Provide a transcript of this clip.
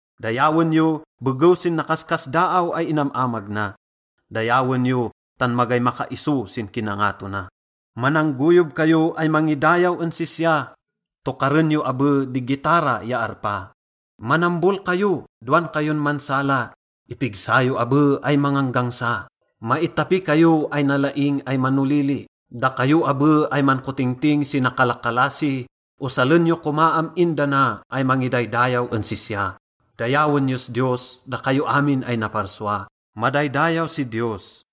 Dayawen yo begew sin nakaskasdaaw ay inam-amag na, dayawen yo tan magay makaiso sin kinangato na. Mananggoyob kayo ay mangidayaw en sisya, tokaren yo abe di gitara ya arpa. Manambol kayo dowan kayon mansala, ipigsa yo abe ay manganggangsa. Maitapi kayo ay nalaing ay manolili, dakayo abe ay mankotingting si nakalakalasi. Osalen yo koma am-in dana ay mangidaydayaw en sisya. Dayawen yos Diyos, dakayo amin ay naparsua. Madaydayaw si Diyos!